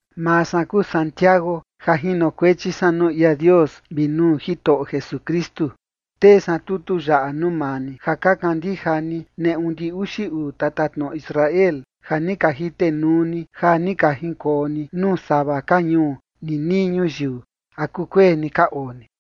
Maa san kuu Santiago ja jinokuechi san nuu ia Dios vi nuu Jitoꞌo Jesukristu. Tee san tutu yaꞌa nuu maa ni, ja ka kandija ni neꞌu ndi uxi uu tatatnoꞌo Israel, ja ni ka jitenuu ni ja ni ka jinkoo ni nuu sava ka ñuu ninii ñuyiu. ¿A kukueni ka oo ni?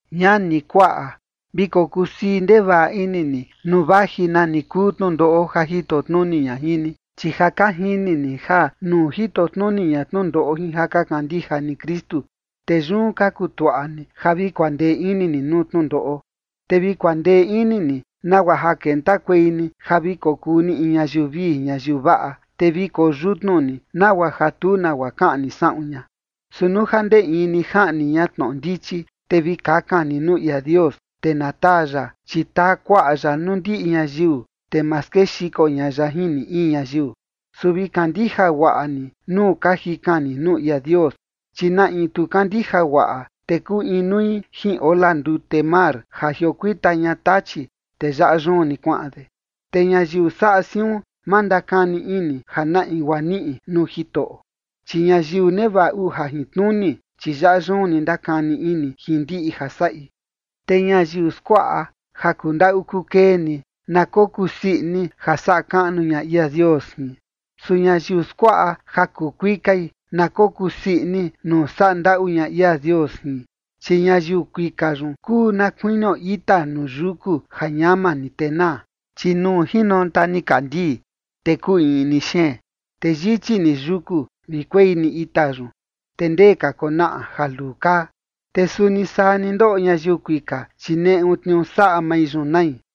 Ñani, kuaꞌa, vi kokusii ndevaꞌa ini ni nuu vaji nani kuu tnundoꞌo ja jito tnuni ña jin ni, chi ja ka jini ni ja nuu jito tnuni ña tnundoꞌo jin ja ka kandija ni Kristu, te yun ka kutuaꞌa ni ja vi kuandee ini ni nuu tnundoꞌo. Te vi kuandee ini ni, nagua ja kentakuei ni ja vi kokuu ni in ñayiu vii ñayiu vaꞌa, te vi koyutnu ni, nagua ja tu nagua kaꞌni saꞌun ña. Su nuu ja ndee in ni jaꞌni ña tnoꞌo ndichi, te vi kakan ni nuu ia Dios, te na taa ya, chi taa kuaꞌa ya nuu ndiꞌi ñayiu, te ma skexiko ña ya jin ni in ñayiu. Su vi kandija guaꞌa ni nuu ka jikan ni nuu ia Dios, chi na in tu kandija guaꞌa, te kuu inui jin ola ndute mar ja jiokuita ña tachi, te yaꞌa yun ni kuaꞌan de. Te ñayiu saꞌa siun, ma ndakani ini ja na in guaa niꞌi nuu Jitoꞌo. Chi ñayiu nevaꞌa uu jajintnuni, chi yaꞌa yun ni ndakani ini jin ndiꞌi ja saꞌi. Te ñayiu skuaꞌa ja kuu ndaꞌu kuu kee ni, na kokusii ini ja saꞌa kaꞌnu ña ia Dios jin. Su ñayiu skuaꞌa ja kuu kuikai, na kokusii ini nuu saꞌa ndaꞌu ña ia Dios jin. Chi ñayiu kuika yun kuu na kuinio ita nuu yuku, ja ñama ni te naa. Chi nuu jinonta nikandii te kuu iꞌni xeen, te yichi ni yuku vi kuei ni ita yun, te ndee ka konaꞌa ja luu kaa, te suni saa ni ndoꞌo ñayiu kuika, chi neꞌu tniuu saꞌa mai yun nai.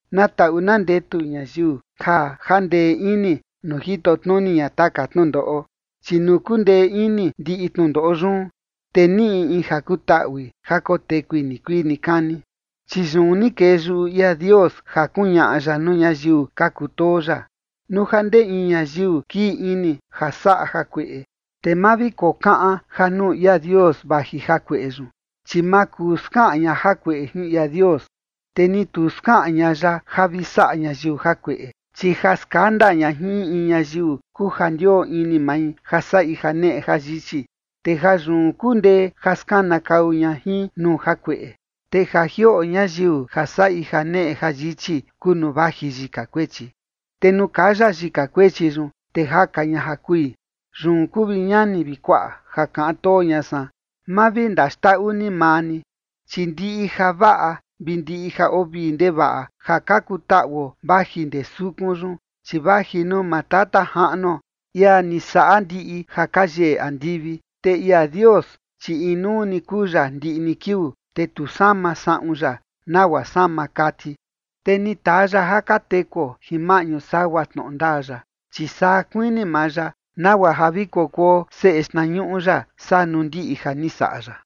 Na taꞌu na ndetu ñayiu ja jandee ini nuu jito tnuni ña taka tnundoꞌo, chi nuu kundee ini ndiꞌi tnundoꞌo yun, te niꞌi in ja kutaꞌui ja kotekui nikuii nikani. Chi yun ni kee yuꞌu ia Dios ja kuñaꞌa ya nuu ñayiu ka kutoo ya. Nuu ja ndee in ñayiu kii ini ja saꞌa jakueꞌe, te ma vi kokaꞌan ja nuu ia Dios vaji jakueꞌe yun, chi ma kuu skaꞌan ña jakueꞌe jin ia Dios, te ni tu skaꞌan ña ya ja vi saꞌa ñayiu jakueꞌe. Chi ja skanda ña jin in in ñayiu kuu ja ndioo ini mai ja saꞌi janeꞌe jayichi, te jayun kundee ja skanakau ña jin nuu jakueꞌe. Te ja jioꞌo ñayiu ja saꞌi janeꞌe jayichi kuu nuu vaji yika kuechi, te nuu kaya yika kuechi yun, te jaka ña ja kui. Yun kuu, vi ñani, vi kuaꞌa, ja kaꞌan too ña san, ma vi ndaxndaꞌu ni maa ni. Chi ndiꞌi javaꞌa vi ndiꞌi ja oo vii ndevaꞌa ja ka kutaꞌuo vaji ndee sukun yun, chi vaji nuu maa Tata Jaꞌnuo, ia ni saꞌa ndiꞌi ja ka yeꞌe andivi. Te ia Dios, chi inuu ni kuu ya ndiꞌi ni kiuu, te tu sama saꞌun ya nagua sama kati. Te ni taa ya ja ka tekuo jin maꞌñu sagua tnoꞌo ndaa ya, chi saa kuini maa ya, nagua ja vi kokuo seꞌe xtnañuꞌu ya saa nuu ndiꞌi ja ni saꞌa ya.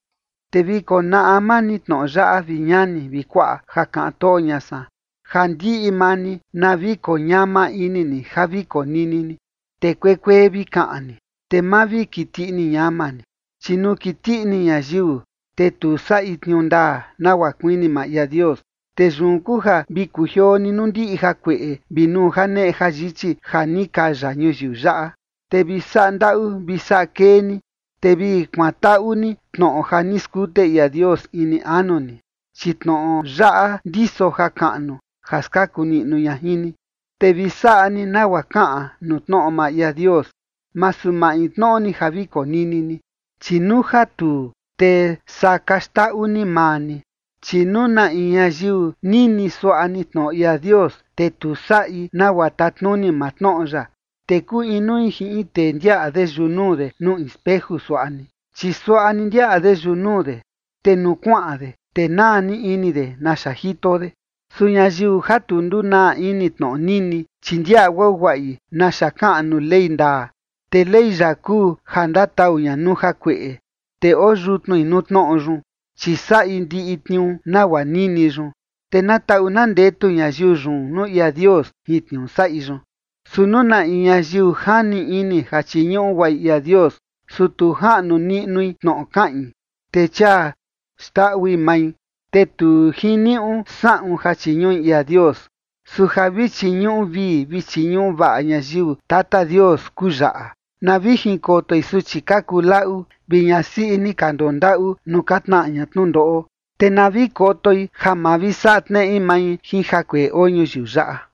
Te vi konaꞌa maa ni tnoꞌo yaꞌa, vi ñani vi kuaꞌa, ja kaꞌan too ña san, ja ndiꞌi maa ni na vi koñama ini ni ja vi konini ni, te kuekuee vi kaꞌan ni, te ma vi kiti ini ñama ni. Chi nuu kiti ini ñayiu, te tu saꞌi tniuu ndaa nagua kuini maa ia Dios. Te yun kuu ja vi kujioo ni nuu ndiꞌi jakueꞌe vi nuu janeꞌe jayichi ja ni kaya ñuyiu yaꞌa, te vi saꞌa ndaꞌu vi saꞌa kee ni, te vi kuantaꞌu ni tnoꞌo ja ni skute ia Dios ini anu ni, chi tnoꞌo yaꞌa ndiso jakaꞌnu ja skaku niꞌnu ña jin ni. Te vi saꞌa ni nagua kaꞌan nuu tnoꞌo maa ia Dios, masu maintnoꞌo ni ja vi konini ni, chi nuu ja tuu, te saa ka xndaꞌu ni maa ni. Chi nuu na in ñayiu nini suaꞌa ni tnoꞌo ia Dios, te tu saꞌi nagua tatnuni maa tnoꞌo yaꞌa, te kuu inui jin in tee ndiaꞌa de yunuu de nuu in speju suaꞌa ni. Chi suaꞌa ni ndiaꞌa de yunuu de, te nuu kuaꞌan de, te naa ni ini de naxa jito de. Su ñayiu ja tu ndunaa ini tnoꞌo nini, chi ndiaꞌa guaguaꞌi naxa kaꞌan nuu ley ndaa, te ley yaꞌa kuu ja ndatau ña nuu jakueꞌe, te oo yutnui nuu tnoꞌo yun, chi saꞌi ndiꞌi tniuu nagua nini yun. Te na taꞌu na ndetu ñayiu yun nuu ia Dios jin tniuu saꞌi yun. Su nuu na in ñayiu jani ini ja chiñuꞌu guaꞌi ia Dios, su tu jaꞌnu niꞌnui tnoꞌo kaꞌin, te chia xndaꞌui mai, te tu jiniuꞌu saꞌun ja chiñuꞌi ia Dios. Su ja vi chiñuꞌu vii vi chiñuꞌu vaꞌa ñayiu Tata Dios kuu yaꞌa: na vi jinkotoi suchi ka kuu laꞌu vi ñasiꞌi ni ka ndondaꞌu nuu ka tnaꞌa ña tnundoꞌo, te na vi kotoi ja ma vi saꞌa tneꞌe mai jin jakueꞌe oo ñuyiu yaꞌa.